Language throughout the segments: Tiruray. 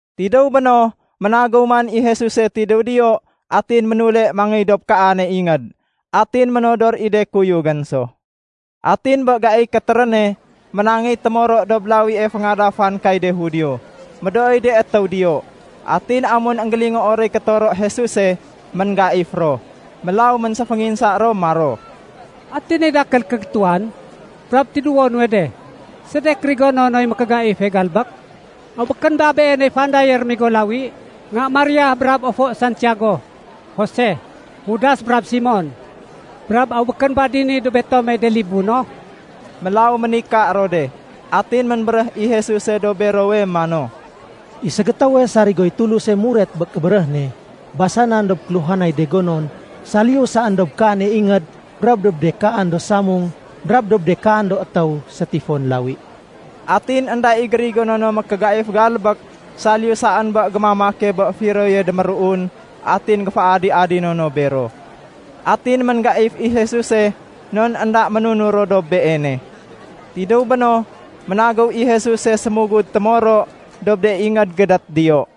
Tidéw béno, ménagéw man i Jesuse tidéw diyo atin ménule mangéy dob kaane ingéd. Atin ménodor i de kuyugén so. Atin bé gaiy kétéréne, ménangéy témoro dob lawie féngadafan kay de Judio. Médooy de étéw diyo, atin amun énggélingoo roy kétoro Jesuse, ménggaif ro. Mélaw ménséfénginsa ro maro, “Ati ni dakél kégétuwan, brab tidéwo nuwe de? Sedek gérigono noy mékégaife galbék? Aw békén ba Beeney fandaye rémigo lawi nga Maria brab ofo Santiago, Jose, Judas brab Simon? Brab aw békén ba dini dob betomey de libu no?” Mélaw ménika ro de. Atin ménbéréh i Jesuse dob berowe mano, “I ségétéwe sarigoy Tuluse muret bé kébéréh ne, basanan dob kéluhanay de gonon saliyu saén dob kaane ingéd brab dob de kaan do samung brab dob de kaan do étéw sétifon lawi.” Atin énda i gérigono no mékégaif galbék saliyu saén bé gémamake bé firoye déméruun atin géféadi-adino no bero. Atin ménggaif i Jesuse non énda ménunur ro dob Beene. Tidéw béno, ménagéw i Jesuse sémugud témoro dob de ingéd gédét diyo.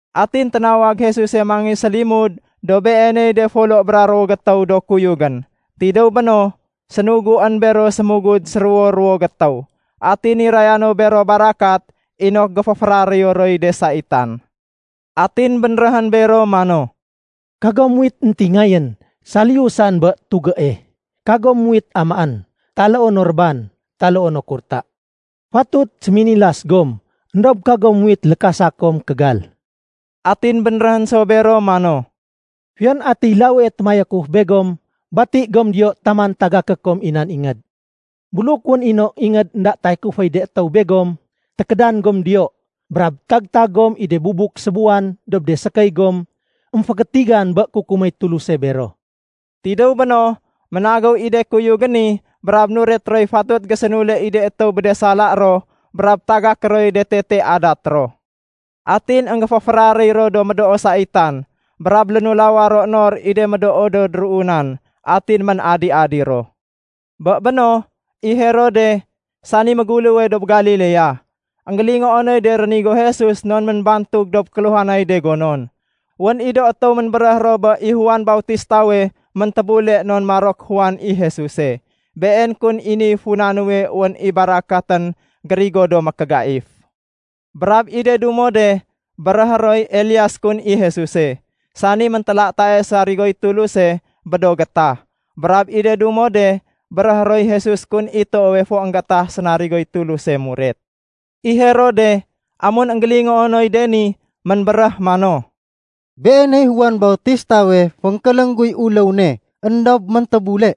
Atin ténawag Jesuse mangéy sélimud dob Beeney de folo bra ruwo gétéw do kuyugén. Tidéw béno, sénuguén bero sémugud séruwo-ruwo gétéw. Atin niraya no bero barakat inok géféféraréyo roy de saitan. Atin bénréhén bero mano, “Kagom muwit éntingayén saliyu saén bé tugée. Kagom muwit amaén, taloo no réban, taloo no kurta. Fatut séminilas gom, éndob kagom muwit lékasa kom kégal.” Atin bénréhén so bero mano, “Fiyon atiy lawie témayakuf begom, bati gom diyo taman tagaké kom i nan ingéd. Buluk wén i no ingéd énda tayakuféy de étéw begom, tékédan gom diyo, brab tag-tag gom i de bubuk sébuwan dob de sékéy gom émfégétigan bé kukuméy Tuluse bero.” Tidéw béno, ménagéw i de kuyugén ni brab nuret roy fatut gésénule i de étéw bé de sala ro brab tagaké roy de tete adat ro. Atin énggéféféraréy ro do médoo saitan, brab lénulawa ro nor i de médoo do déruunan atin ménadi-adi ro. Bé béno, i Herode, sani méguléwe dob Galilea, énggélingoo noy de rénigo Jesus non ménbantug dob kéluhanay de gonon. Wén i do étéw ménbéréh ro bé i Juan Bautistawe méntébule non maro ké Juan i Jesuse. Been kun i niy funa nuwe wén i barakatén gérigo do mékégaif. Brab i de dumo de béréhé roy Elias kun i Jesuse, sani méntélatae sarigoy Tuluse bé do gétah. Brab i de dumo de béréhé roy Jesus kun i toowe fo énggétah sénarigoy Tuluse muret. I Herode, amun énggélingoo noy de ni, ménbéréh mano, “Beeney Juan Bautistawe fénkéléng guy uléw ne, éndob méntébule.”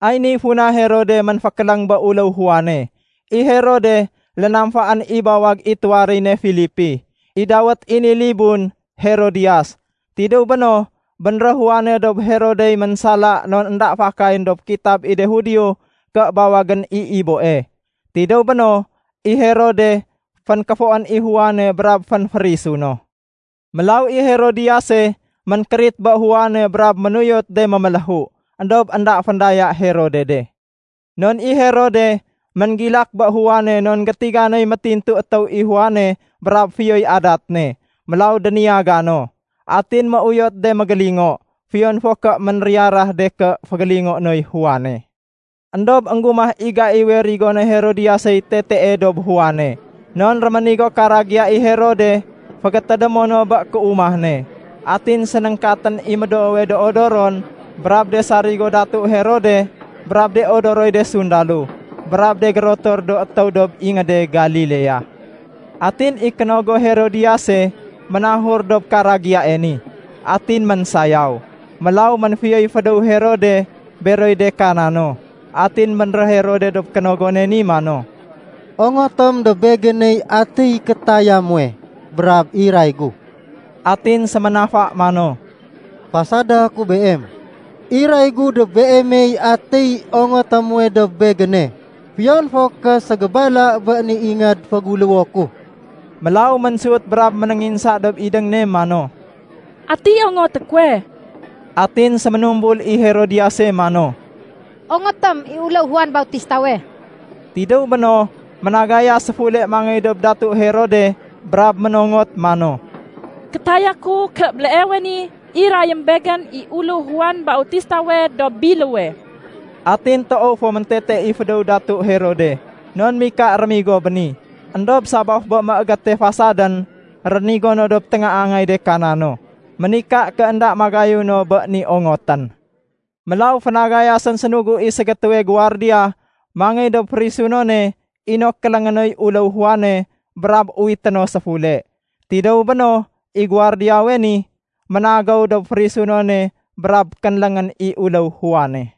Ay niy funa Herode ménfékéléng bé uléw Juane. I Herode lénamfaén i bawag i tuwaréy ne Filipi. I dawét i ni libun Herodiyas. Tidéw béno, bénréh Juane dob Herodey ménsala non énda fakayén dob kitab i de Judio ké bawagén i iboe. Tidéw béno, i Herode fénkéfoén i Juane brab fénférisu no. Mélaw i Herodiyase ménkérit bé Juane brab ménuyot de méméléhu, éndob énda féndaya Herode de. Non i Herode ménggilak bé Juane non gétiga noy métintu étéw i Juane brab fiyoy adat ne. Mélaw déniyaga no. Atin méuyot de mégélingo, fiyon fo ké ménriyarah de ké fégélingoé noy Juane. Endob énggumah i gaiwe rigoné Herodiyasey tetee dob Juane. Non réménigo karagiya i Herode fégétédémo no bé kéumah ne. Atin sénéngkatén i médoowe do odoron brab de sarigo datu Herode brab de odoroy de sundalo, brab de gérotor do étéw dob ingéde Galilea. Atin i kénogo Herodiyase ménahur dob karagiyae ni, atin ménsayaw. Mélaw ménfiyoy fédéw Herode beroy de kana no. Atin bénréh Herode dob kénogone ni mano, “Ongotém dob begéney atiy kétaya muwe, brab iray gu.” Atin séménafa mano, “Fasada ku beem, iray gu dob beemey atiy ongoté muwe dob begéne, fiyon fo ké ségébala bé ni ingéd féguléwo ku.” Mélaw ménsut brab ménénginsa dob idéng ne mano, “Ati ongoté kuwe?” Atin séménumbul i Herodiyase mano, “Ongotém i uléw Juan Bautistawe.” Tidéw béno, ménagayas séfule mangéy dob datu Herode brab ménongot mano, “Kétaya ku ké béleewe ni irayém begén i uléw Juan Bautistawe dob biléwe.” Atin toow fo méntete i fédéw datu Herode, non mika rémigo bé ni. Endob sabaf bé méégéte fasadén rénigo no dob téngaangay de kana no, ménika ké énda magayun no bé ni ongotén. Mélaw fénagayasén sénugu i ségétéwe guwardiya mangéy dob férisunone inok kéléngé noy uléw Juane brab uwité no séfule. Tidéw béno, i guwardiyawe ni, ménagéw dob férisunone brab kénléngén i uléw Juane.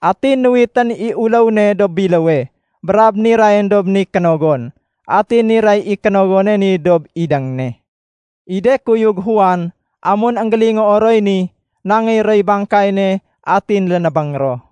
Atin nuwitén i uléw ne dob biléwe, brab nirayén dob ni kénogon. Atin niray i kénogone ni dob idéng ne. I de kuyug Juan, amun énggélingoo roy ni, nangéy roy bangkay ne, atin lénébéng ro.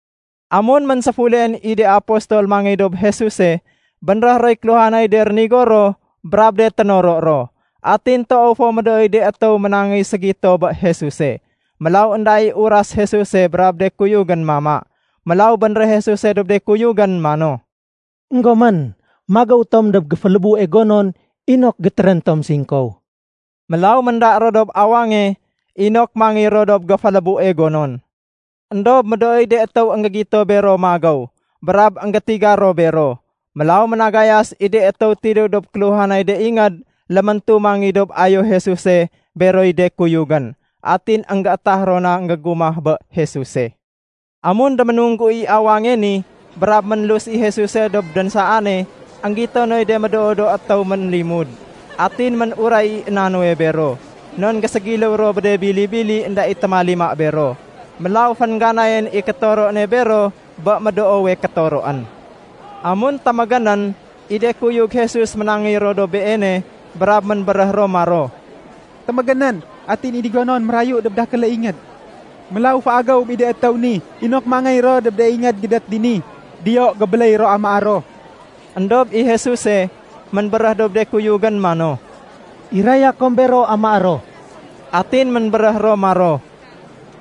Amun ménséfuleén i de apostol mangéy dob Jesuse, bénréh roy kéluhanay de rénigo ro brab de ténoro ro. Atin toow fo médooy de étéw ménangéy ségito bé Jesuse, mélaw énda i uras Jesuse brab de kuyugén mama. Mélaw bénréh Jesuse dob de kuyugén mano, “Enggomén, magéw tom dob géfélébue gonon inok gétérén tom singkow.” Mélaw ménda ro dob awange inok mangéy ro dob géfélébue gonon. Endob médooy de étéw énggégito bero magéw, brab énggétiga ro bero. Mélaw ménagayas i de étéw tidéw dob kéluhanay de ingéd léméntu mangéy dob ayo Jesuse beroy de kuyugén. Atin énggétah ro na énggégumah bé Jesuse. Amun déménunggu i awange ni brab ménlus i Jesuse dob dénsaane, énggito noy de médoo do étéw ménlimud. Atin ménuray i na nuwe bero, non géségiléw ro bé de bili-bili énda i témalima bero. Mélaw féngganayén i kétoro ne bero bé médoowe kétoroén. Amun témégénén, i de kuyug Jesus ménangéy ro dob Beene brab ménbéréh ro maro, “Témégénén, atin i ni gonon mérayu dob dakéle ingéd. Mélaw féagéwém i de étéw ni inok mangéy ro dob de ingéd gédét dini. Diyo gébéléy ro amaé ro.” Endob i Jesuse ménbéréh dob de kuyugén mano, “Iraya kom bero amaé ro.” Atin ménbéréh ro maro,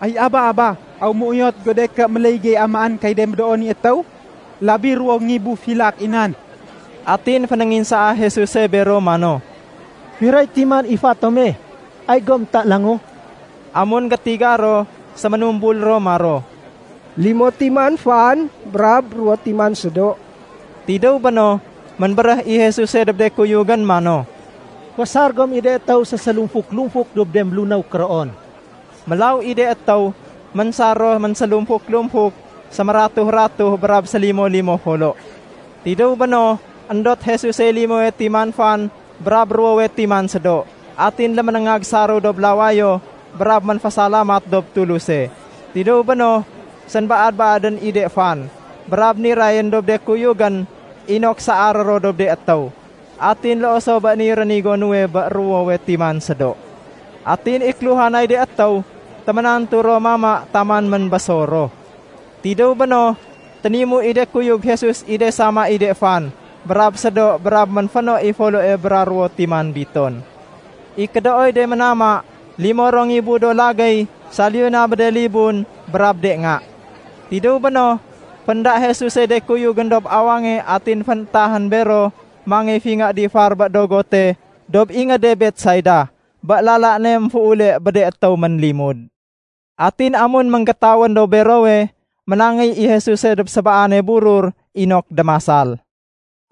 “Ay aba-aba, aw méuyot go de ké méléy gey amaén kay de médoowe ni étéw? Labi ruwo ngibu filak i nan!” Atin fénénginsaa Jesuse bero mano, “Firoy timan i fa tome? Ay gom ta langu.” Amun gétiga ro, séménumbul ro maro, “Limo timan fan brab ruwo timan sédo.” Tidéw béno, ménbéréh i Jesuse dob de kuyugén mano, “Féésar gom i de étéw sésélumfuk-lumfuk dob de mélunéw kéroon.” Mélaw i de étéw, ménsar ro ménsélumfuk-lumfuk, sémératuh-ratuh brab sélimo-limo folo. Tidéw béno, éndot Jesusey limowe timan fan brab ruwowe timan sédo, atin léménéngag saréw dob lawayo brab ménfésalamat dob Tuluse. Tidéw béno, sénbaad-baadén i de fan, brab nirayén dob de kuyugén inok saaré ro dob de étéw. Atin loo so bé niy rénigo nuwe bé ruwowe timan sédo. Atin i kéluhanay de étéw, téménantu ro mama taman ménbésor ro. Tidéw béno, ténimu i de kuyug Jesus i de sama i de fan brab sédo brab ménféno i foloe bra ruwo timan biton. I kédooy de ménama, limo ro ngibu do lagéy saliyu na bé de libun brab de nga. Tidéw béno, fénda Jesusey de kuyugén dob awange atin fénétahén bero mangéy fingé difar bé dogote dob ingéde Betsaida, bé lala ne émféule bé de étéw ménlimud. Atin amun ménggétawén dob berowe, ménangéy i Jesuse dob sébaane burur inok démasal.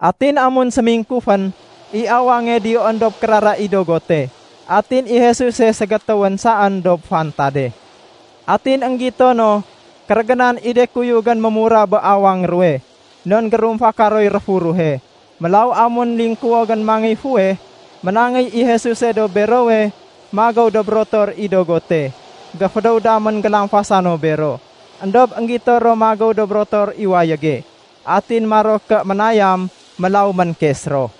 Atin amun sémingkufén, i awange diyoén dob kérara i dogote. Atin i Jesuse ségétéwén saén dob fantade. Atin énggito no kérégénan i de kuyugén mémurah bé awang ruwe, non gérumfaka roy réfuruhe. Mélaw amun lingkuwogén mangéy fuweh, ménangéy i Jesuse dob berowe magéw dob rotor i dogote. Géfédéw damén gélamfasa no bero, éndob énggito ro magéw dob rotor i wayége. Atin maro ké ménayam. Mélaw ménkes ro.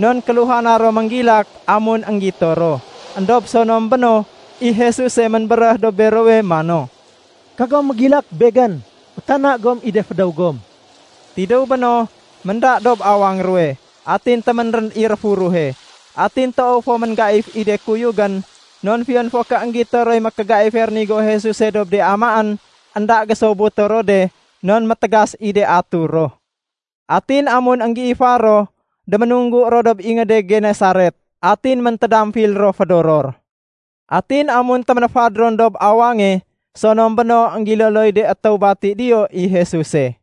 Non kéluhana ro ménggilak amun énggito ro. Endob sonom béno, i Jesuse ménbéréh dob berowe mano, “Kagom mégilak! Begén. Fétana gom i de fédéw gom.” Tidéw béno, ménda dob awang ruwe. Atin téménrén i réfuruhe. Atin toow fo ménggaif i de kuyugén, non fiyon fo ké énggito roy mékégaife rénigo Jesuse dob de amaén, énda gésobuto ro de non métégas i de atur ro. Atin amun énggéifar ro, déménunggu ro dob ingéde Genesaret, atin ménamfil ro fédoror. Atin amun téménéfad ron dob awange, sonom béno énggiloloy de étéw bati diyo i Jesuse.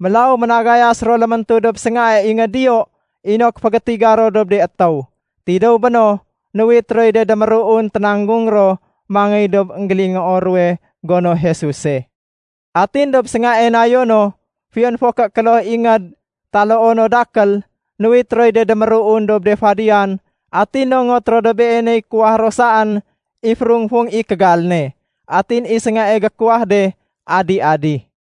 Mélaw ménagayas ro léméntu dob séngae ingéd diyo inok fégétiga ro dob de étéw. Tidéw béno, nuwit roy de déméruun ténanggung ro mangéy dob énggélingoo ruwe gono Jesuse. Atin dob séngae nayo no, fiyon fo ké kloh ingéd taloo no dakél, nuwit roy de déméruun dob de fadiyan, atin nongot ro dob Beeney kuwahé ro saén i férung-fung i kégal ne. Atin i séngae gékuwah de adi-adi.